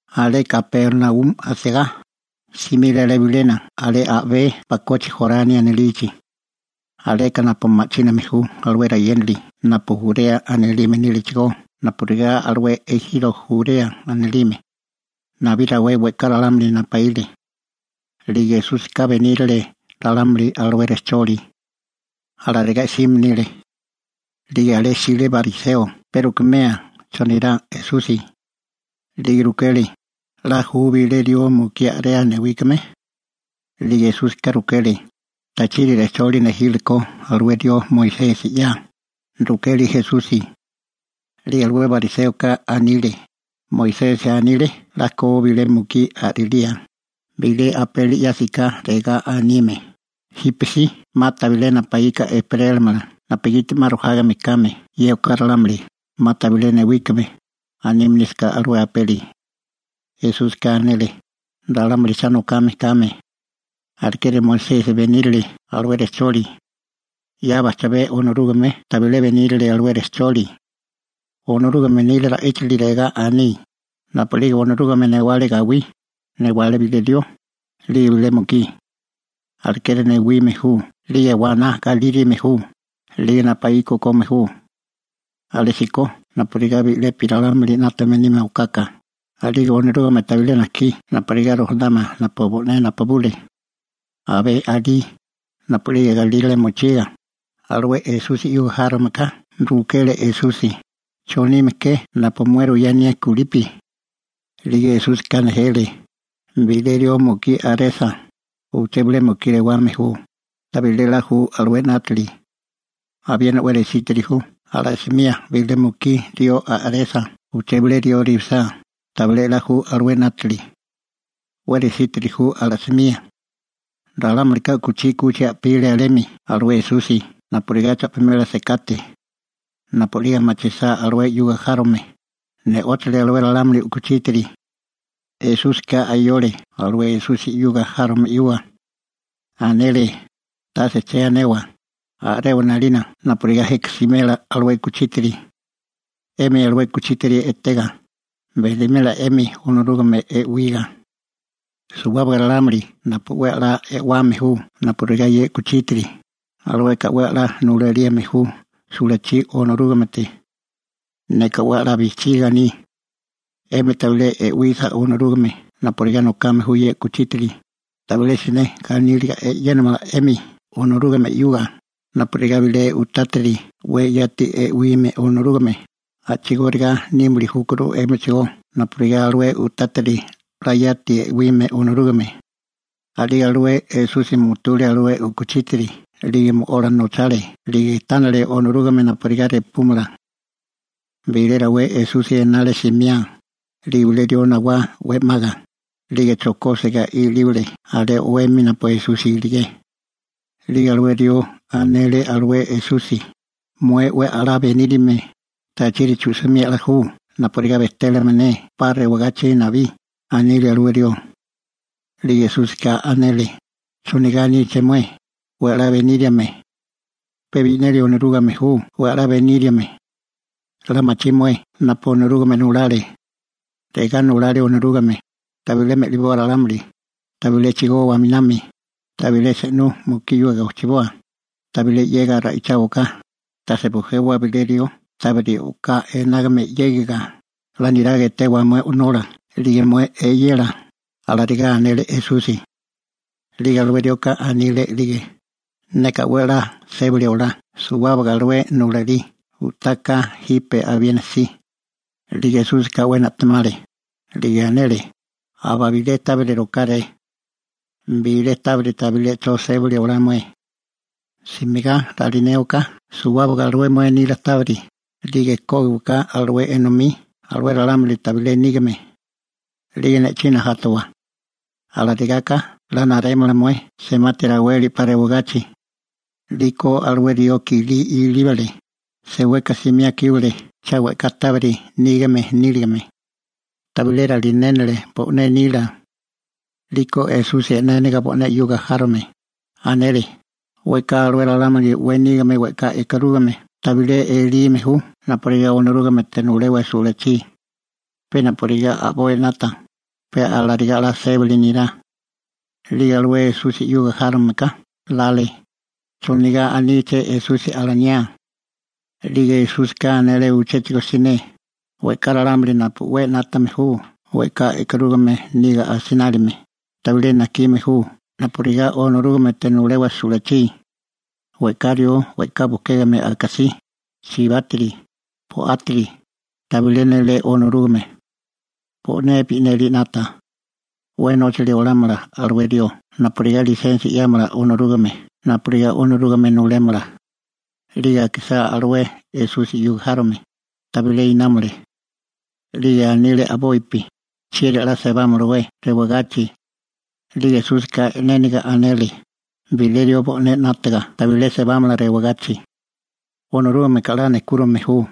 Alé Kapernaumi asigá, simile alé bilena alé a'bé bakochi Jorani anilichi, aleka napu ma'chíname ju alué rayénali napu Jurea anilime nílechigó napurigá alué ejiro Jurea anilime. Nabí rawé we'ká ralámuli napaíle. 'Lige Esúsika benírale rejcholi alué ralámuli. Alarigá 'sime nile. 'Lige alé jsile bariseo pe rukemia chonirá Esusi. 'Lige rukele: ―¿'La ju bilé rió mukí a'rea newíkame? 'Lige Esúsika rukele: ―¿Tachiri rejcholi nejile ko alué rió Moisesi 'ya? ―rukele Esusi. 'Lige alué bariséoka anile: ―Moisesi anile 'la ko bilé mukí a'rilía, bilé apeli 'yásiká regá anime: «Jípesí 'ma tabilé napaíka ejperélamala napugiti 'ma rojágame kame ye oká ralámuli, 'ma tabilé newíkame», anime nísaká alué apeli. Esúsika anele: ―Ralámuli cha nokame kame. Alekeri Moisesi benírele alué rejcholi. 'Ya bajchabé Onorúgame tabilé benírele alué rejcholi. Onorúgame nila ra'íchili regá aní: «Napu'lige Onorúgame newale gawí, newale bilé rió, 'lige bilé mukí.» Alekeri newime ju 'lige waná galírime ju, 'lige napuíka okome ju. Alésíko napurigá bi'lepi ralámuli 'nátame nímala okaka, 'lige Onorúgame tabilé najkí napurigá rojanawa napu bo'né napabule. Abé alí, napu'lige galírale mochiga, alué Esusi 'yuga járome ka rukele Esusi: ―¿Chonime ke napu mué ruyá anié kulipi? 'Lige Esúsika nejele: ―Bilé rió mukí a'resa, uché bilé mukí rewame ju, tabilé 'la ju alué 'nátili. Abiena 'we resítiri ju ala'simía bilé mukí rió a'resa uché bilé rió rewisá, tabilé 'la ju alué 'nátili. 'We resítiri ju ala'simía. Ralámulika u'kuchí 'kuchi a'pile alemi alué Esusi napurigá cha'pimela sekate. Napu a'lige machisá alué 'yuga járome, ne'óchale alué ralámuli u'kuchítiri. Esúsika ayole alué Esusi 'yuga járome 'yuga. Anele: ―Tase che anewa, a'rewa 'nalina napurigá jeka smela alué u'kuchítiri. 'Emi alué u'kuchítiri etega, benimela 'emi Onorúgame e'wiga. Suwábaga ralámuli napu 'we a'lá e'wame ju napurigá ye u'kuchítiri, alueka 'we a'lá nulalíame ju sulachí Onorúgamete. Neka 'we a'lá bijchiga aní. 'Emi tabilé e'wisa Onorúgame napurigá nokame ju ye u'kuchítiri, tabilé siné ganíliga e'yénamala 'emi Onorúgame 'yuga. Napurigá bilé u'tátiri 'we yati e'wime Onorúgame, a'chigóriga nímili júkuru 'émichigó napurigá alué u'tátiri 'la yati e'wime Onorúgame. A'lige alué Esusi mutule alué u'kuchítiri 'lige mo'ola nochale 'lige tánale Onorúgame napurigá repúmala. Bilé rawé Esusi enale simiá, 'lige bilé rió nawá 'we 'maga, 'lige chokóbasiga ilíbale alé o'wemi napu Esusi iligé. 'Lige alué rió anele alué Esusi: ―Mué 'we a'lá beníriame, ¿tachiri chu'simía 'la ju napurigá bejtélamala ne 'pa rewagachi nabí? ―anile alué rió. 'Lige Esúsika anele: ―¿Chonigá aníché mué: «'We a'lá beníriame»? Pe bi'neli Onorúgame ju 'we a'lá beníriame. 'La machí mué napu Onorúgame nulale. Regá nulale Onorúgame: «Tabilé me'liboa ralámuli, tabilé chigowa aminami, tabilé se'nú mukí 'yuga gojchiboa, tabilé 'yega ra'icháwaká, tase bujewa bilé rió tábiri o'ká enágame 'yégiga, 'la niraga etewa mué o'nola 'lige mué eyela» ―alarigá anele Esusi. 'Lige alué rioka anile a'lige: ―Neka 'we a'lá sébali olá suwábaga alué nulalí u'tá ka jipe abiena si. 'Lige Esúsika 'we na'temale, 'lige anele: ―Aba bilé tábiri rokáré. Bilé tábiri tabilé 'cho 'la sébali olá mué. Simigá ralinéwaká suwábaga alué mué nila tábiri, 'lige kógiwaká alué enomí alué ralámuli tabilé nígame. 'Lige ne'chí najátawa. Alarigáká 'la narémala mué semati raweli 'pa rewagachi. 'Liko alué rió kilí ilíbale, seweka simiá kíbale cha we'ká tábiri nígame níligame. Tabilé ralinénele bo'né nila. 'Liko Esusi e'néniga bo'né 'yuga járome, anele: ―We'ká alué ralámuli 'we nígame we'ká e'karúgame tabilé elime ju napurigá Onorúgamete nulewa sulachí. Pe napurigá a'boi 'nata, pe alarigá 'la sébili nirá. 'Lige alué Esusi 'yuga járome ka lale: «¿Chonigá aníché Esusi alaniá?» 'Lige Esúsika anele uchéchigo siné: ―We'ká ralámuli napu 'we 'nátame ju we'ká e'karúgame niga asinálime, tabilé najkime ju napurigá Onorúgamete nulewa sulachí. We'ká rió we'ká bukégame akasí, chibátiri, bo'átiri, tabilé nélé Onorúgame. Bo'né bi'neli 'nata. 'We nóchili olámala alué rió napurigá lisensia 'yámala Onorúgame napurigá Onorúgame nulémala. 'Lige akisá alué Esusi 'yuga járome, tabilé inámole. 'Lige anile a'bopi: ―¿Chieri 'la sebámalawé alé rewagachi? 'Lige Esúsika e'néniga anele: ―Bilé rió bo'né 'nátaga tabilé sebámala rewagachi. Onorúgameka 'la nejkúrime ju,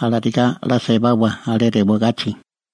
alarigáká 'la sebawa rewagachi.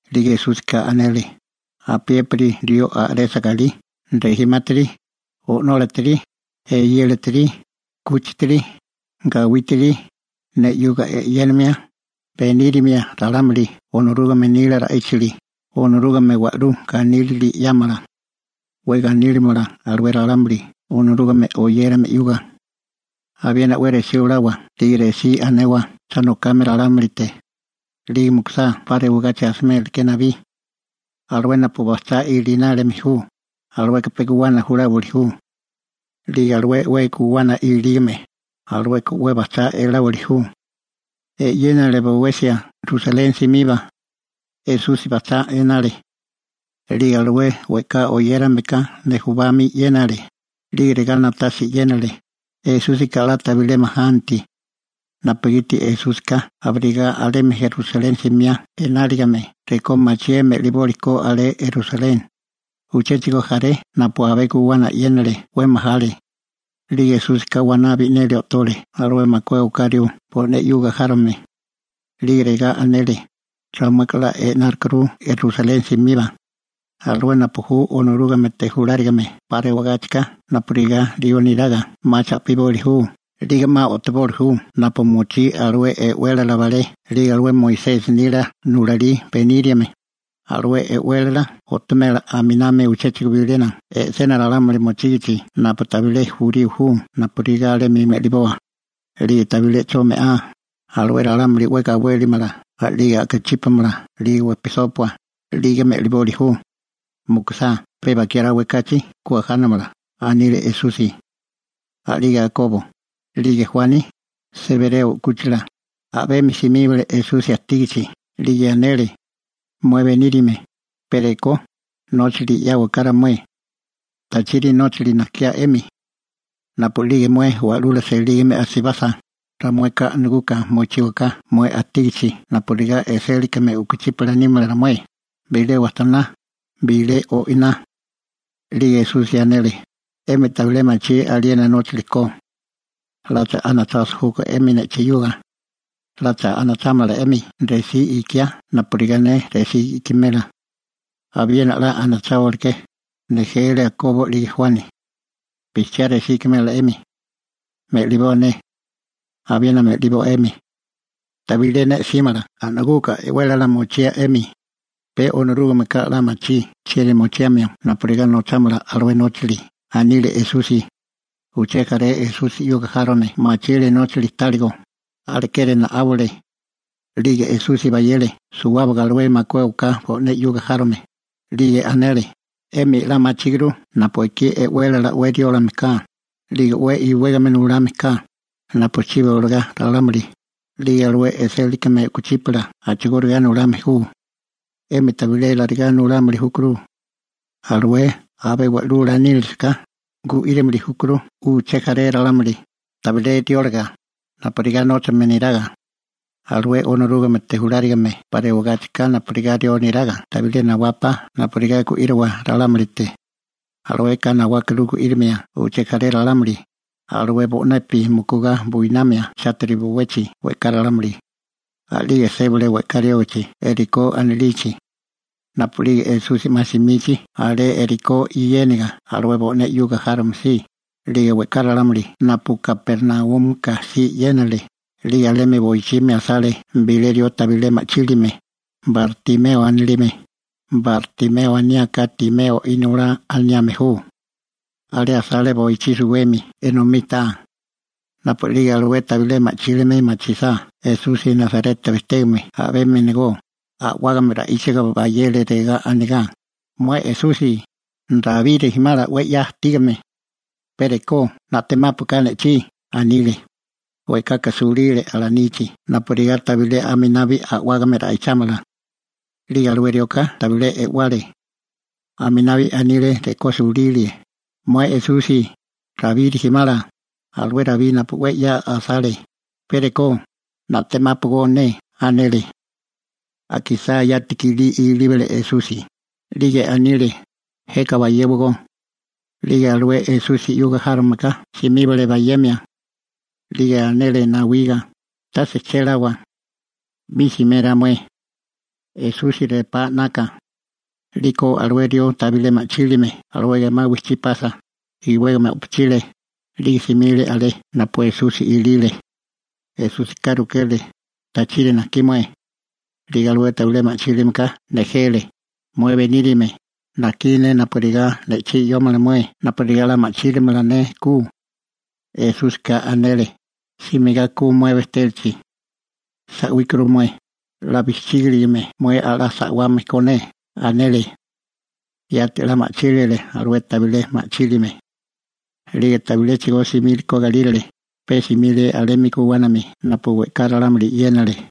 'Lige Esúsika anele: ―Apiépiri rió a'resa galí, rejimátiri, o'nólatiri, eyélatiri, 'kúchitiri, gawítiri, ne 'yuga e'yénimia, benírimia ralámuli Onorúgame nila ra'íchili, Onorúgame wa'lú ganílili 'yámala. 'We ganílimala alué ralámuli Onorúgame oyérame 'yuga. Abiena 'we resí olawa 'lige resí anewa cha nokame ralámulite. 'Lige mukusá 'pa rewagachi asiméleké nabí. Alué napu bajchá ilinálime ju, alueka pe guwana juláwili ju. 'Lige alué 'we guwana ilígame, alueka 'mi bajchá eláwili ju. E'yénale bowesia Rusaleni simiba. Esusi bajchá enale. 'Lige alué we'ká oyérameka nujubami 'yénale, 'lige regá na'tasia e'yénale: «¡Esúsika 'la tabilé majanti!» napugiti Esúsika abirigá alemi Rusaleni simiá enáligime rekó machié me'liboli ko alé Rusaleni. Uchéchigo jaré napu abé guwana e'yénale 'we majale. 'Lige Esúsika waná bi'neli o'tole alué makué oká rió bo'né 'yuga járome. 'Lige regá anele: ―Ramueka 'a e'nárukuru Rusaleni simiba. Alué napu ju Onorúgamete julárigame 'pa rewagáchika napurigá rió neraga 'ma cha'piboli ju, 'lige 'ma o'toboli ju napu mochí alué e'wélala balé 'lige alué Moisesi nila nulalí beníriame. Alué e'wélala o'tomela a'miná uchéchigo bilena e'sena ralámuli mochígichi napu tabilé jurío ju napurigá alemi me'liboa. 'Lige tabilé 'cho me'á, alué ralámuli 'we gawélimala 'lige a'kachípamala 'lige wejpisópua, 'lige me'liboli ju. Mukusá pe bakiá rawé kachi ku ajánamala ―anile Esusi. A'lige Jakobo, 'lige Juani, Sebereo 'kúchila, a'bemi simíbale Esusi ajtígachi 'lige anele: ―Mué beníriame, pe rekó, nóchali 'yáwaká ramué. ―¿Tachiri nóchali najkiá 'emi? ―rukele Esusi. ―Napu'lige mué wa'lula selígame asibasa, ramueka a'naguka mochíwaká mué ajtígichi napurigá e'sélikame u'kuchípala nímala ramué, bilé wajtoná, bilé o'iná. 'Lige Esusi anele: ―'Emi tabilé machí aliena nóchali ko. ¿'Lacha anachasa júkó 'emi ne'chí 'yuga? ¿'Lacha anachámala 'emi resí ikiá napurigá ne resí ikimela? ―Abiena 'la anacháwaleké ―nejele Akobo 'lige Juani. ―Bijchiá resí ikimela 'emi. Me'liboa ne. Abiena me'liboa 'emi. Tabilé ne 'símala a'naguka e'wélala mochía 'emi. Pe Onorúgameka 'la machí chieri mochiamio napurigá nochámala alué nóchali ―anile Esusi. Uché jaré Esusi 'yuga járome machile nóchali táligo, alekeri na'áwale. 'Lige Esusi bayele suwábaga alué makué oká bo'né 'yuga járome, 'lige anele: ―'Emi 'la machíguru napu ekí e'wélala 'we riólame ka, 'lige 'we iwégame nulame ka, napuchibi olagá ralámuli, 'lige alué e'sélikame u'kuchípala a'chigóriga nulame ju. 'Emi tabilé alarigá nulámili júkuru. Alué abé wa'lula nínilisi ka, gu'írimili júkuru uché jaré ralámuli, tabilé rióliga, napurigá nóchame neraga. Alué Onorúgamete julárigame 'pa rewagáchika napurigá rió neraga tabilé nawápá napurigá gu'íriwa ralámulite. Alueka nawákuru gu'írimia uché jaré ralámuli, alué bo'nepi mukugá buinamia chátiri bowechi we'ká ralámuli. A'lige sébale we'ká riógichi Jerikó anilichi. Napu'lige Esusi 'ma simichi alé Jerikó yéniga alué bo'né 'yuga járome si, 'lige we'ká ralámuli napu Kapernaúmika si 'yénale, 'lige alemi boichimi asale bilé rió tabilé ma'chílime, Bartimeo anilime (Bartimeo aniáká Timeo inolá aniame ju). Alé asale boichí suwemi enomí taa. Napu a'lige alué tabilé ma'chílime machisá Esusi Nasareta bejtégame a'bemi enegó, a'wágame ra'íchaga bayele regá anigá: ―¡Mué Esusi, Rabí rijimala, Rabí 'we 'ya ajtígame, pe rekó na'temápuaká ne'chí! ―anile. We'kaka sulile alanichi napurigá tabilé aminabi a'wágame ra'ichámala. 'Lige alué rioka tabilé e'wale. Aminabi anile rekó sulílie: ―¡Mué Esusi, Rabí rijimala, alué rabí napu 'we 'ya asale, pe rekó, na'temápogó ne! ―anele. Akisá yati kilí ilíbale Esusi, 'lige anile: ―Jeka bayéwagó. 'Lige alué Esusi 'yuga járomeka simíbale bayemia. 'Lige anele nawiga: ―Tase chéláwa. 'Mi simérá mué. Esusi repá 'naka. 'Liko alué rió tabilé ma'chílime alué gemá wijchí pasa, iwégame o'pochile, 'lige simile alé napu Esusi ilile. Esúsika rukele: ―¿Tachiri najkí mué? 'Lige alué tabilé ma'chílimeka nejele: ―Mué beníriame, najkí ne napurigá ne'chí 'yómala mué napurigá 'la ma'chílimala ne ku. Esúsika anele: ―Simigá ku mué bejtélachi. Sa'wíkuru mué, 'la bijchígiligame mué 'la sa'wame ko ne ―anele. Yati 'la ma'chílile alué tabilé ma'chílime. 'Lige tabiléchigo simíleko galírale, pe simile alemi guwánami napu we'ká ralámuli 'yénale.